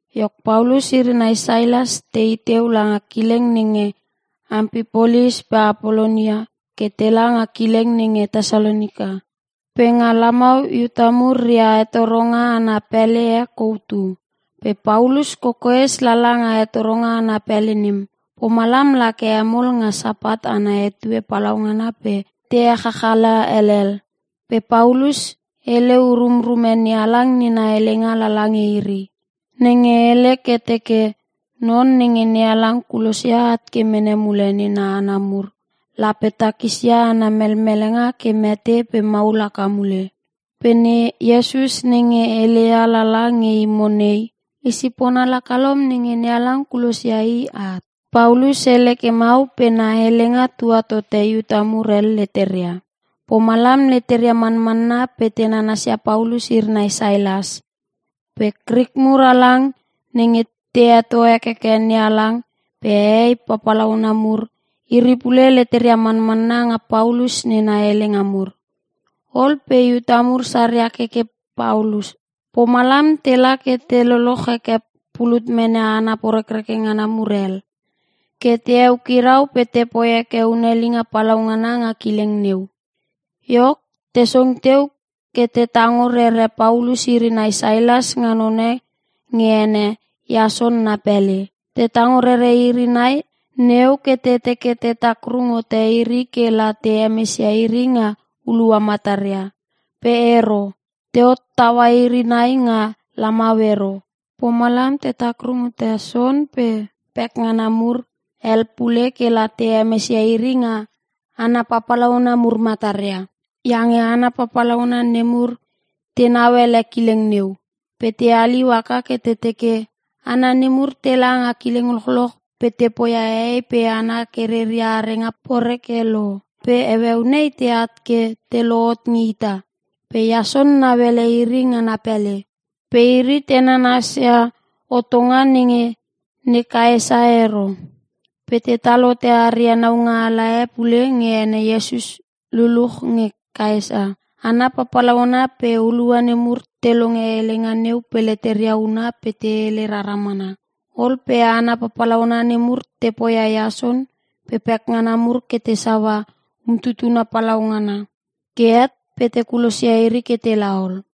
Iok, Paulus iri nai Sailas tei teu langa kileng nenge Ampipolis pe Apolonia ke tela nga kileng nenge Tesalonika. Pe nga lamau Iuta mur ria hetoronga ana pele e kou tu. Pe Paulus kokoes lala nga hetoronga ana pele nem, pomalam lake hemol nga Sapat ana etue palaungana pe te echachala helel. Pe Paulus hele urumrume NeHalang nena helenga lala nge iri. Nenge hele ke teke, Non nenge NeHalang kulosia at ke mene mule nena hana mur, lape takisia ana melmelenga ke mete pe maul haka mule. “Pe ne Iesus nenge e heleia lala nge imo nei, i sipona lakalom nenge NeHalang kulosia i at.” Paulus hele ke mau pe na helenga tua tote Iuta mur hel leteria. Pomalam leteria manmanna pe te nanasia Paulus iri nai Sailas. Pe Krik mur halang nenge te heto hekeke NeHalang, pe hehei papalauna mur, iri pule leteria manmanna nga Paulus nena helenga mur. Ol pe Iuta mur saria keke Paulus. Pomalam tela ke te loloch heke pulut mene hana porekreke ngana mur hel, ke te eukirau pe tepoi heke hunelinga palaungana nga kileng neu. Iok, te song teu ke te tango rere Paulus iri nai Sailas nga none nge ene Iason na pele. Te tango rere iri nai neu ke te teke te takrung hote iri kela te hemesia iri nga hulua mataria. Pe ero. Te hottaua iri nai nga lamau ero. Pomalam te takrung hote Iason pe pekngana mur hel pule kela te hemesia iri nga hana papalauna mur mataria. Iange hana papalauna nemur tenau ele kileng neu. Pe te haliu haka ke te teke, “Hana nemur tela nga kileng lochloch pe te poia hehei pe hana ke reria arenga poreke lo pe heueu nei teat ke te lohot nge ita. Pe Iason nauele iri nga na pele. Pe iri te nanasia hotonga nenge ne Kaesa ero. Pe tetal hote aria naungaala e pule nge ene Iesus luluch nge Kaesa.” Hana papalauna pe hulua nemur te longe helenga neu pe leteria huna pe te hele rara mana. Ol pe hana papalauna nemur te poia Iason pe pekngana mur ke te saua umtutuna palaungana. Ke het pe te kulosia iri ke tela ol.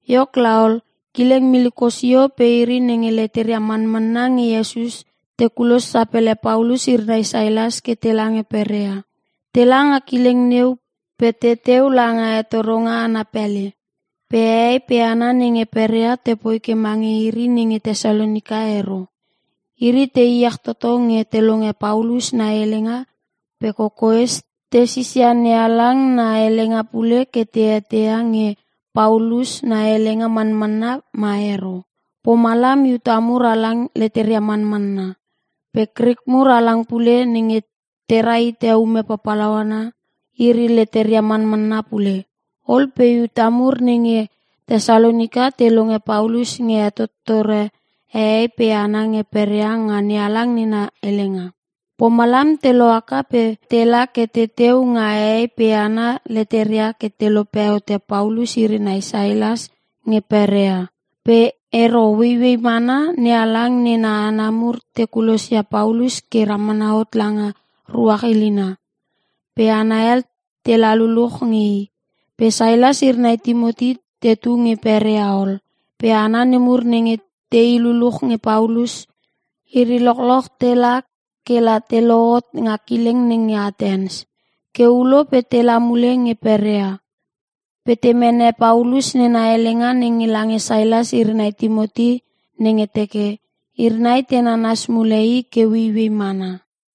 Iok laol, kileng miliko sio pe iri nenge leteria manmanna nge Iesus te kulos sapele Paulus iri nai Sailas ke tela nge Perea. Tela nga kileng neu pe teteu langa hetoronga ana pele. Pe hehei pe hana nenge Perea tepoi ke mange iri nenge Tesalonika ero. Iri te iech toto nge te longe Paulus na helenga pe kokoes te sisia NeHalang na helenga pule ke te eteia nge Paulus na helenga manmanna ma ero. Pomalam Iuta mur halang leteria manmanna. Pe Krik mur halang pule, nenge tera hite ume papalauna, iri leteria manmanna pule. Ol pe Iuta mur nenge Tesalonika te longe Paulus nge hetottore hehei pe hana nge Perea nga NeHalang na helenga. Pomalam te lohaka pe tela ke teteu nga hehei pe hana leteria ke te lope hote Paulus iri nai Sailas nge Perea. Pe ero. Ueiuei mana NeHalang nena hana mur te kulosia Paulus ke ramana hot langa ruach ilina. Pe hana hel tela luluch nge i. Pe Sailas iri nai Timoti tetu nge Perea ol. Pe hana nemur nenge tei luluch nge Paulus, iri lochloch tela kela te lohot nga kileng nenge Atens. Ke ulo pe tela mule nge Perea. Pe te mene Paulus nena helenga nenge lange Sailas iri nai Timoti nenge teke, iri nai te nanas mule i ke ueiuei mana.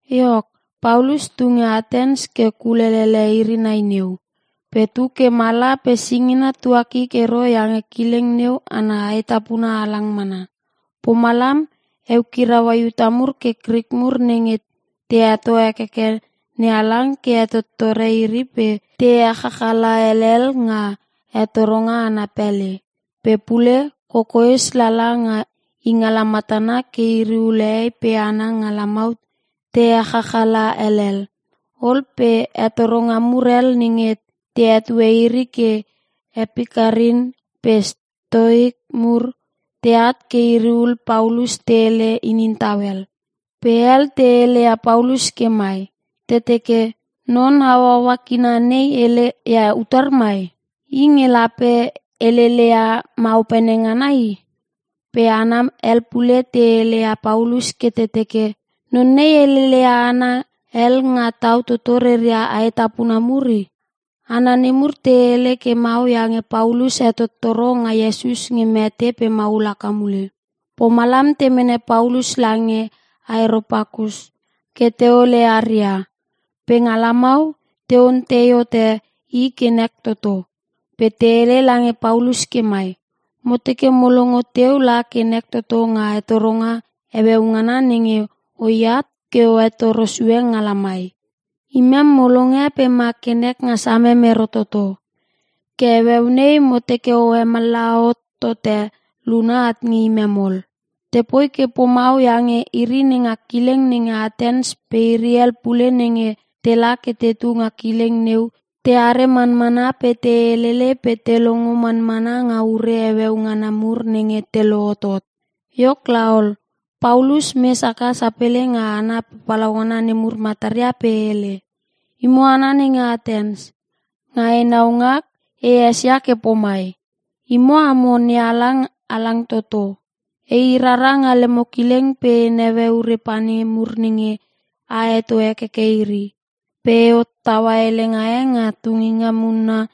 Iok, Paulus tu nge Atens ke kulele iri nai neu. Pe tu ke mala pe singina tuakik ero iange kileng neu ana aetapuna halang mana. Pomalam eukiraua Iuta mur pe Krik mur nenge te heto hekeke NeHalang ke hetottore iri pe te echachala helel nga hetoronga ana pele. Pe pule, kokoes lala nga ingala matana ke iri ul hehei pe hana nga lamau te echachala helel. Ol pe hetoronga mur hel nenge te hetue iri ke Epikarin pe Stoik mur, teat ke iri ul Paulus te hele inin tau hel. Pe hel te heleia Paulus ke mai, te teke, “Non hauaua kina nei hele ia utar mai? I nge lape heleleia maopene ngana i.” Pe hana hel pule te heleia Paulus ke te teke, “Non nei heleleia hana hel nga tau toto reria aetapuna mur i.” Hana nemur te hele ke mau iange Paulus hetottoro nga Iesus nge mete pe maul haka mule. Pomalam te mene Paulus lange Areopakus, ke teole aria. Pe nga lamau, te ontei hote i ke nek toto. Pe te hele lange Paulus ke mai, “Mo teke mo longo teu la ke nek toto nga hetoronga heueu ngana nenge oiat ke o hetoro sue nga lamai. Imem mo longe pe ma ke nek nga samem ero toto, ke heueu nei mo teke o hemallaha hot tote luna at nge imem ol.” (Tepoi ke pomau iange iri nenga kileng nenge Atens pe iri hel pule nenge tela ke tetu nga kileng neu teare manmana pe te helele pe te longo manmana nga ure heueu ngana mur nenge te lohotot.) Iok laol, Paulus mes haka sapele nga hana papalauna nemur mataria pe hele, “Imo hana nenge Atens. Nga enau ngak, e esia ke pomai. Imo amo nehalang halang toto. Ei rara nga lemo kileng pe e neue ure pane mur nenge a heto hekeke iri. Pe e hottaua helenga e nga tunginga munna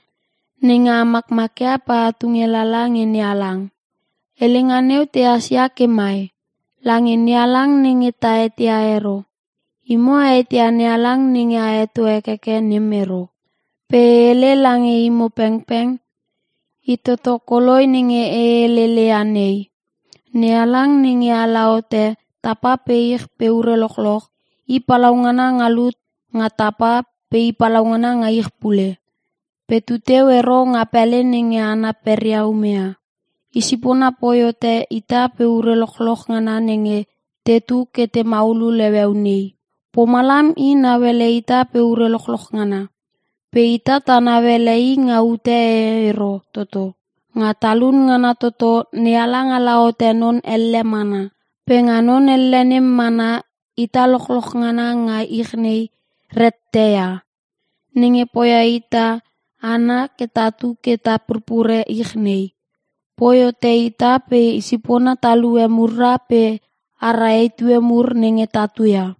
nenge a makmakia pe a tunge lala nge nehalang. Helenga neu tehas ia ke mai; ‘Lange nehalang nenge ta eteia ero.’ Imo a eteia nehalang nenge a heto hekeke nem ero. Pe e hele lange imo pengpeng, I toto koloi nenge e heleleia nei. NeHalang nenge ala hote tapa pe ich pe ure lochloch, i palaungana nga lut nga tapa pe i palaungana nga ich pule. Pe tuteu ero nga pele nenge hana peria umeia. Isipona poi hote ita pe ure lochloch ngana nenge tetu ke te maulul heueu nei. Pomalam i nauele ita pe ure lochloch ngana. Pe ita ta nauele i nga ute e ero toto. Nga talun ngana toto NeHalang ala hote non elle mana. Pe nga non elle nem mana ita lochoch ngana nga ich nei, rette ia. Nenge poia ita hana ke tatu ke ta purpure ich nei. Poi hote ita pe i sipona talue mura pe ara etue mur nenge tatu ia.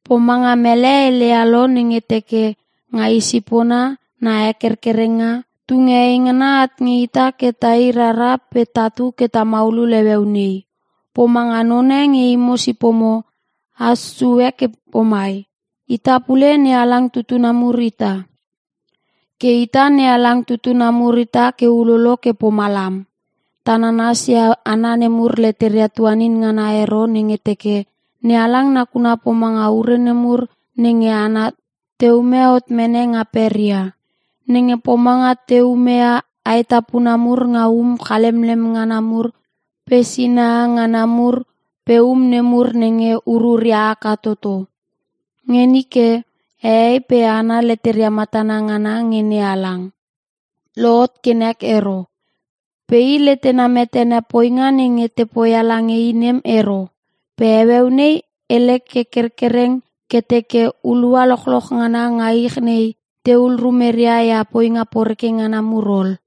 Pomanga mele heleia lo nenge teke, ‘Nga i sipona na hekerkerenga, tunge eingana at nge ita ke tai rara pe tatu ke ta maulul heueu nei.’ Pomanga none nge imo sipomo, has sue ke pomai, ‘Ita pule NeHalang tutuna mur ita.’ Ke ita NeHalang tutuna mur ita ke ulolo ke pomalam, ta nanas ia hana nemur leteria tuanin ngana ero nenge te teke, NeHalang nakuna pomanga ure nemur nenge hana te ume hot mene nga peria. Nenge pomanga te umeia aetapuna mur nga um chalemlem ngana mur pe sinaha ngana mur pe um nemur nenge ururia haka toto. Nge nike, hehei pe hana leteria matana ngana nge NeHalang, lohot ke nek ero. Pe i letena metene poinga nenge te poia lange i nem ero. Pe heueu nei hele ke kerkereng ke teke hulua lochloch ngana nga ich nei tehul rumeria ia poinga poreke ngana mur ol.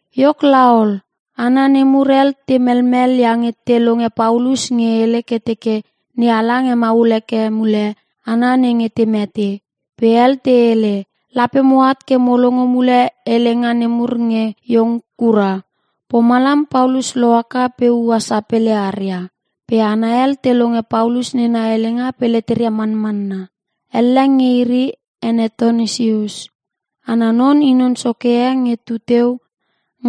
Iok laol, hana nemur hel te melmel iange te longe Paulus nge hele ke teke NeHalang hemaul heke mule hana nenge te mete. Pe hel te hele, “Lape moat ke mo longo mule helenga nemur nge iong kura.” Pomalam Paulus lohaka pe ua sapele aria. Pe hana hel te longe Paulus nena helenga pe leteria manmanna. Elle nge iri, ene Tonisius. Ana non i non soke e nge tu teu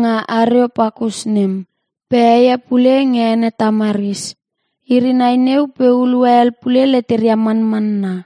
nga Areopakus nem. Pe heie pule nge ene Tamaris. Iri nai neu pe hulua hel pule leteria manmanna.